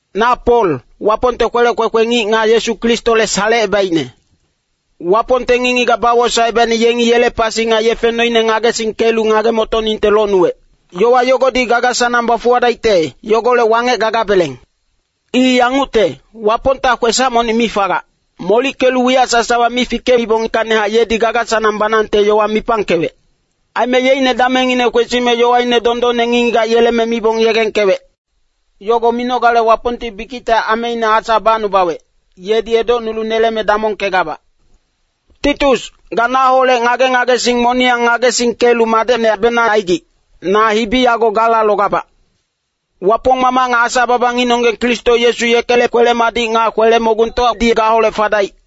Na Pol, Wapongte kwelec kwekwe ngic nga Yesu Kristole salecebaicne. Wapongte ngic-ngigac bawosaecebaicne yengi yele pasi nga yefe noine ngagesingkelu ngage-motoningte locnuwec. Yowa yogodi gaga-sanang bafuwadaicte, yogolec wangec gagabeleng. I yangucte, Wapongta kwesac monic mi fagac. Molickelu wiyac sasawa mi fikeibongkacnihac yedi gaga-sanang banangte yowa mipangkewec. Aime yeicne damengngine kwesime yowaine dondonne ngic-ngigac yeleme mibong yegengkewec. Yogo minogale Wapongti bikicte ameine Asa bacnubawec, yedi edocnulu neleme damongkegabac. Titus, ga naholec ngage-ngagesing moniyang ngagesingkelu madecnebenang aigic, na hibi yago gala logabac. Wapong Mamac nga Asa-baba ngicnonggeng Kristo Yesu, yekele kwele-madic nga kwele-mogungtowadi gaholec fadaic.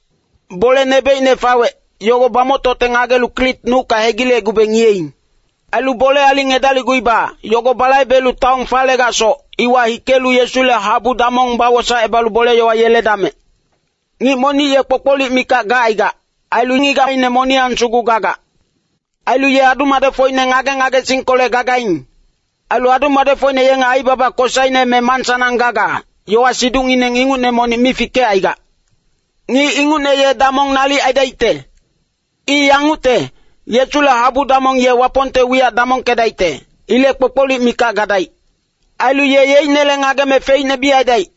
Bole nebocine fawec, yogo bamoctocte ngagelu Krit nucka hegilecgube ngiyeing. Ailu bole aling edalicguiba, yogo balaibelu taon falegacsoc, iwa hikelu Yesule habu damong bawosaecebalu bole-yowa yeledamec. Ngic monic ye kpokpolic mikac gacaigac, ailu ngigacine moniyang sugu gagac. Ailu ye adu-madecfocine ngage-ngagesingkolec gagaing. Ailu adu-madecfocine yenge aibaba kosaine me mansanang gaga, yowa-siducngineng ingucne monic mi fikecaigac. Ngic ingucne ye damong nalic aidaicte. I yangucte, Yesule habu damong ye Wapongte wiyac damongkedaicte. Ilec kpokpolic mikac gadaic. Ailu ye yeicnele ngageme feicne mi aidaic.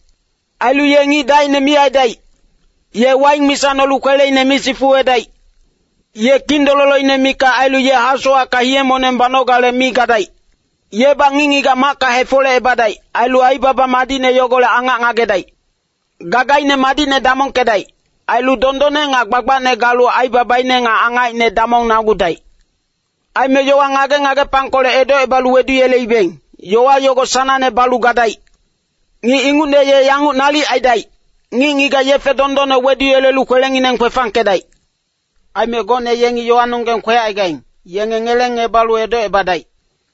Ailu ye ngic dacine mi aidaic. Ye waing misa nolu kweleine mi sifuwedaic. Ye kindololoine mikac ailu ye hasowacka hiye-moneng banogale mi gadaic. Yebac ngic-ngigac macka hefolecebadaic. Ailu aibaba madicne yogolec angac ngagedaic. Gagaine madicne damongkedaic. Ailu dondonne nga gbagbacne galu aibabaine nga angacine damongnagudaic. Aime yowa ngage-ngagepangkolec edocebalu weduyeleibeng, yowa yogo sanangne balu gadaic. Ngic ingucne ye yanguc nalic aidaic, ngic-ngigac yefe dondonne weduyelelu kwelengineng kwefangkedaic. Aime gocne yengi yowanonggeng kwecaigaing, yenge ngelengebalu edocebadaic.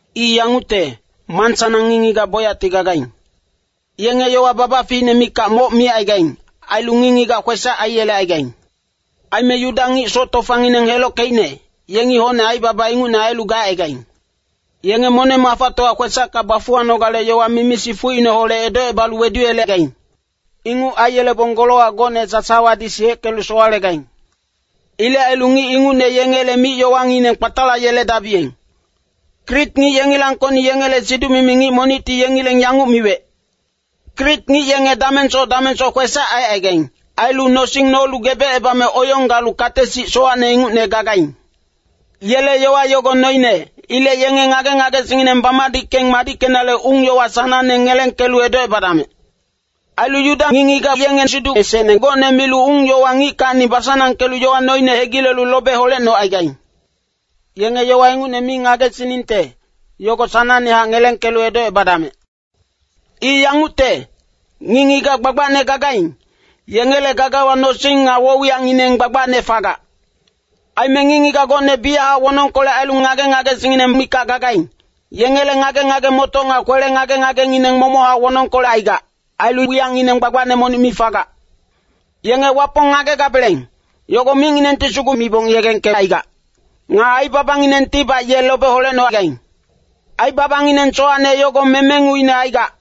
I yangucte, mansanang ngic-ngigac bocyacti gagaing. Yenge yowa babaficine mikac moc micaigaing. Ailu ngic-ngigac kwesac aiyelecaigaing. Aime Yuda ngic soc tofangineng helockeicne, yengi hocne aibaba ingucne ailu gacaigaing. Yenge moneng-mafatowa kwesacka bafuwanogale yowa mimi-sifucineholec edocebalu weduyelegaing. Inguc aiyelebong golowac gocne sasawadi siyeckelu sowalegaing. Ilec ailu ngic ingucne yengele mic-yowangineng kpatalayeledabiyeng. Krit ngic yengilangkocni yengele siduc-mimi ngic monicti yengileng yanguc miwec, “Krit ngic yenge damengsoc damengsoc kwesac aicaigaing. Ailu nosing nolu gebecebame oyong galu kate-sic sowacne ingucne gagaing.” Yele yowa yogo noine. Ilec yenge ngage-ngagesingngineng bamadickeng madickenale ung-yowa sanangne ngelengkelu edocebadamec. Ailu Yuda ngic-ngigac yenge siduc esecne gocne milu ung-yowa ngickacni basanangkelu yowa noine hegilelu lobe holecnocaigaing. Yenge yowa ingucne mi ngagesiningte, yogo sanangnehac ngelengkelu edocebadamec. I yangucte, ngic-ngigac gbagbacne gagaing, yengele gagawa nosing nga woc-wiyacngineng gbagbacne fagac. Aime ngic-ngigac gocne biyachac wonongkolec ailu ngage-ngagesingngineng mikac gagaing, yengele ngage-ngage-motoc nga kwele ngage-ngagengineng momochac wonongkolec aigac. Ailu wiyacngineng gbagbacne monic mi fagac. Yenge Wapong ngagegabeleng, yogo micnginengti sugu mibong yegengkecaigac. Nga aibabanginengtibac ye lobe holecnogaing. Aibabangineng sowacne yogo memenguine aigac.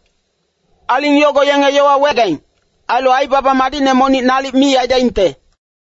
Aling yogo yenge yowa wegaing. Ailu aibaba madicne monic nalic mi aidaingte.